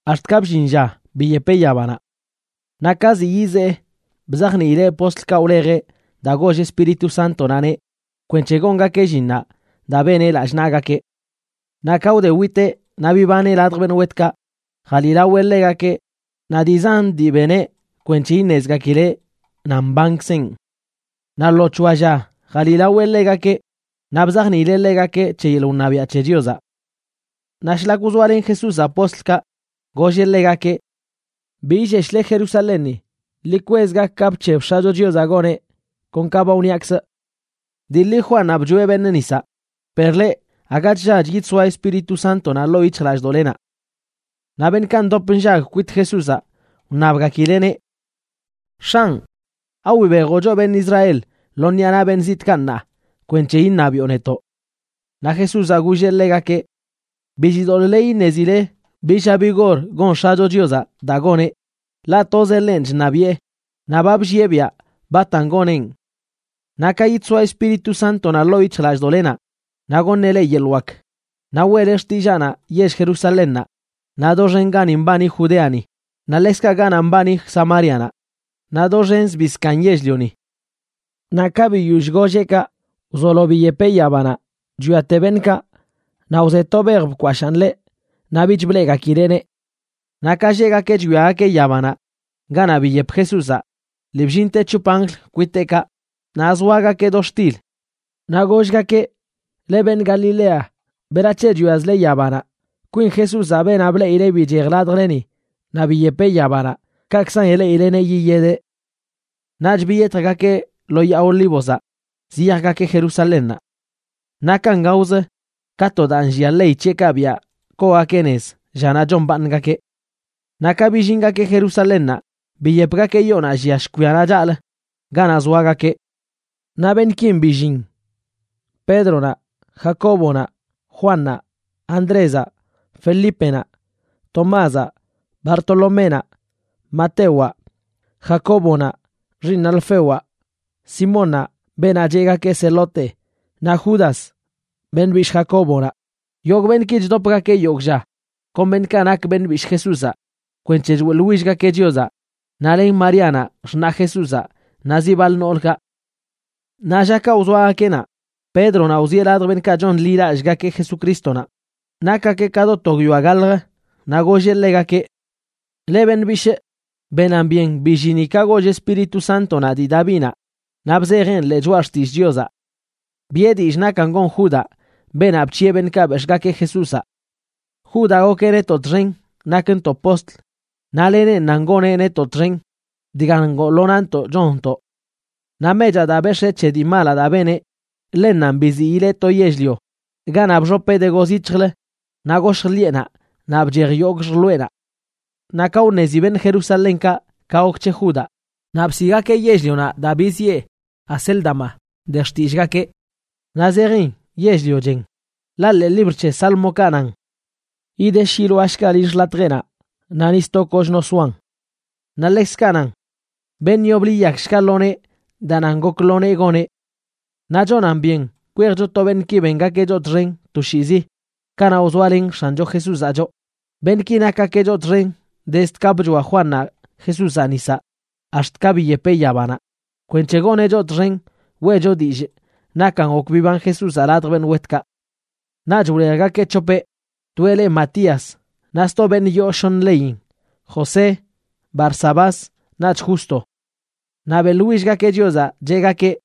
ax̱t ka bllin lla biyepeꞌ yabanaꞌ. Naꞌ ka ziꞌ yizee, bzajniileꞌ postlkaꞌ wlejeꞌ daa goll Espíritu Sántonaꞌneꞌ kwenc̱he gongakeꞌ llinnaꞌ daa beneꞌ lallꞌ naꞌgakeꞌ. Naꞌ ka wde witeꞌ naꞌ bibaneꞌ ladj beṉꞌ wetkaꞌ, jaliꞌlaweꞌ ḻegakeꞌ naꞌ dii zan dii beneꞌ kwenc̱he iṉezgakileꞌ nan mbankzenꞌ. Naꞌ lo c̱hoa lla jaliꞌlaweꞌ ḻegakeꞌ, naꞌ bzajniileꞌ ḻegakeꞌ c̱he yeḻꞌ wṉabiaꞌ c̱he Chiozaꞌ. Naꞌ shlak wzoalen Jesúzaꞌ postlkaꞌ, golleꞌ ḻegakeꞌ: ―Bi illeshle Jerusalénni. Ḻi kwez gak ka bc̱heb X̱acho Chiozaꞌ goneꞌ, kon ka ba wniakzꞌ. Dii ḻi Juannaꞌ bchoeꞌ beṉꞌ nisaꞌ, per leꞌ, aga chllach yidsoa Espíritu Sántonaꞌ ḻoo yic̱hjlallꞌdoꞌlenaꞌ. Naꞌ beṉꞌkaꞌ ndop nllag kwit Jesúzaꞌ, wṉabgakileꞌneꞌ: ―X̱anꞌ, ¿awibejoꞌ choꞌ beṉꞌ Israel lo ṉiꞌa naꞌ beṉꞌ zitꞌkaꞌ ṉaa kwenc̱he iṉabiꞌo netoꞌ? Naꞌ Jesúzaꞌ golleꞌ ḻegakeꞌ: ―Bi chidoḻꞌle iṉezile bi lla bi gor gon X̱acho Chiozaꞌ daa goneꞌ, ḻaꞌ tozeꞌ ḻenꞌ chṉabiꞌe naꞌ ba bllieꞌ biaꞌ batan goneꞌn. Naꞌ ka yidsoa Espíritu Sántonaꞌ ḻoo yic̱hjlallꞌdoꞌlenaꞌ naꞌ goṉeꞌ leꞌ yeḻꞌ wak, naꞌ weꞌle xtillaanaꞌ yell Jerusalénnaꞌ, naꞌ doxen gani mbani Judeani naꞌ ḻekzkaꞌ ganaꞌ mbani Samárianaꞌ, naꞌ doxen zbii zkaaṉ yell-lioni. Naꞌ ka biyoll golleꞌ kaꞌ, wzolo biyepeꞌ yabanaꞌ chwiate beṉꞌkaꞌ, naꞌ wze to bej bkwashaan ḻeꞌ naꞌ bich bleꞌgakileꞌneꞌ. Naꞌ ka lleꞌgakeꞌ chwiagakeꞌ yabanaꞌ ganaꞌ biyep Jesúzaꞌ, lii bllinte c̱hop anjl kwiteꞌkaꞌ, naꞌ zoagakeꞌ do xtil. Naꞌ gollgakeꞌ: ―Leꞌ beṉꞌ Galilea, ¿berac̱he chwiazle yabanaꞌ? Kwin Jesúzaꞌ, beenaꞌ bleꞌile bichej ladjleni naꞌ biyepeꞌ yabanaꞌ, kakzan ileꞌileneꞌ yiyedeꞌ. Naꞌch biyetjgakeꞌ lo Yaa Olívozaꞌ ziyajgakeꞌ Jerusalénnaꞌ. Nakan gaozə, ka to daa nllia ley c̱heꞌkaꞌ biaꞌ koogakeꞌ nez llanaꞌ chombaaṉgakeꞌ. Naꞌ ka billingakeꞌ Jerusalénnaꞌ, biyepgakeꞌ yoonaꞌ llia shkwianaꞌ chaꞌlə ganaꞌ zoagakeꞌ. Naꞌ beṉꞌkin billin: Pédronaꞌ, Jacóbonaꞌ, Juannaꞌ, Andrézaꞌ, Felípenaꞌ, Tomázaꞌ, Bartoloménaꞌ, Matewaꞌ, Jacóbonaꞌ xiiṉ Alfewaꞌ, Simón, beenaꞌ cheꞌgakeꞌ Zelote, naꞌ Judas beṉꞌ bishꞌ Jacóbonaꞌ.a Yogꞌ beṉꞌki chdopgakeꞌ yogꞌ lla kon beṉꞌkaꞌ nak beṉꞌ bishꞌ Jesúzaꞌ kwenc̱he choeꞌḻwillgakeꞌ Chiozaꞌ, naꞌ len Maríanaꞌ xṉa Jesúzaꞌ naꞌ ziꞌ baḻ noolkaꞌ. Naꞌ llakaꞌ wzoagakeꞌ naꞌ, Pédronaꞌ wzieꞌ ladj beṉꞌkaꞌ chonḻilallꞌgakeꞌ Jesucrístonaꞌ, nakgakeꞌ ka do to guiyoa gaḻjə, naꞌ golleꞌ ḻegakeꞌ: ―Leꞌ beṉꞌ bishꞌ, benan byen billinin ka goll Espíritu Sántonaꞌ dii Davinaꞌ naꞌ bzejeꞌn ḻee Choꞌa Xtillꞌ Chiozaꞌ. Biꞌe dillꞌ nakan gon Judaꞌ, beenaꞌ bc̱hiꞌe beṉꞌkaꞌ bex̱ꞌgakeꞌ Jesúzaꞌ. Judaꞌ gokeꞌ netoꞌ txen nakntoꞌ postl, naꞌ lenenꞌ nan goneꞌ netoꞌ txen dga ngoo lo naꞌntoꞌ chonntoꞌ. Naꞌ mechaꞌ daa bex̱ee c̱he dii malaꞌ daa beneꞌ, ḻennanꞌ biziileꞌ to yell-lio ganaꞌ bxopeꞌ de gozyic̱hjlə naꞌ goshj ḻiꞌenaꞌ naꞌ bchej yogꞌ xjloeꞌnaꞌ. Naꞌ ka wṉezi beṉꞌ Jerusalénkaꞌ ka gok c̱he Judaꞌ, naꞌ bsiꞌgakeꞌ yell-lionaꞌ daa biziꞌe Acéldama de xtillꞌgakeꞌ, naꞌ zejin Yell-lio Chen. Ḻaꞌ ḻee libr c̱he Sálmokaꞌ nan: Yidesh yiloashga lill xḻatjeꞌnaꞌ, naꞌ ni sto kochno soan. Naꞌ ḻekzkaꞌ nan: Beṉꞌ yoblə yiyakshga lo nee daa nan gok lo nee goneꞌ. ’Naꞌ chonan byen kwejcho to beṉꞌki bengakeꞌ choꞌ txen toshiizi kanaꞌ wzoalen X̱ancho Jesúzaꞌ choꞌ, beṉꞌki nakgakeꞌ choꞌ txen dezd ka bchoa Juannaꞌ Jesúzaꞌ nisaꞌ ax̱t ka biyepeꞌ yabanaꞌ, kwenc̱he goneꞌ choꞌ txen weꞌcho dillꞌ nakan gok biban Jesúzaꞌ ladj beṉꞌ wetkaꞌ. Naꞌch wlejgakeꞌ c̱hopeꞌ: toeꞌ le Matías, naꞌ sto beṉꞌ yoo shoṉə leyin, José, Barsabás, naꞌch Justo. Naꞌ beꞌḻwillgakeꞌ Chiozaꞌ, cheꞌgakeꞌ: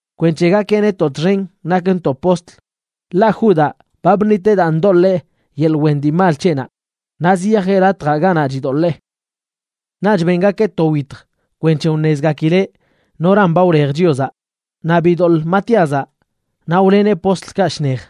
kwenc̱he gakeꞌ netoꞌ txen nakntoꞌ postl, ḻaꞌ Judaꞌ ba bṉiteꞌ daa ndoḻee yeḻꞌ wen dii mal c̱heꞌnaꞌ naꞌ ziyajeꞌ latjaꞌ ganaꞌ chidoḻee. Naꞌch bengakeꞌ to wyitj kwenc̱he wṉezgakileꞌ noran ba wlej Chiozaꞌ, naꞌ bidoḻꞌ Matíazaꞌ, naꞌ wleneꞌ postlkaꞌ shnej.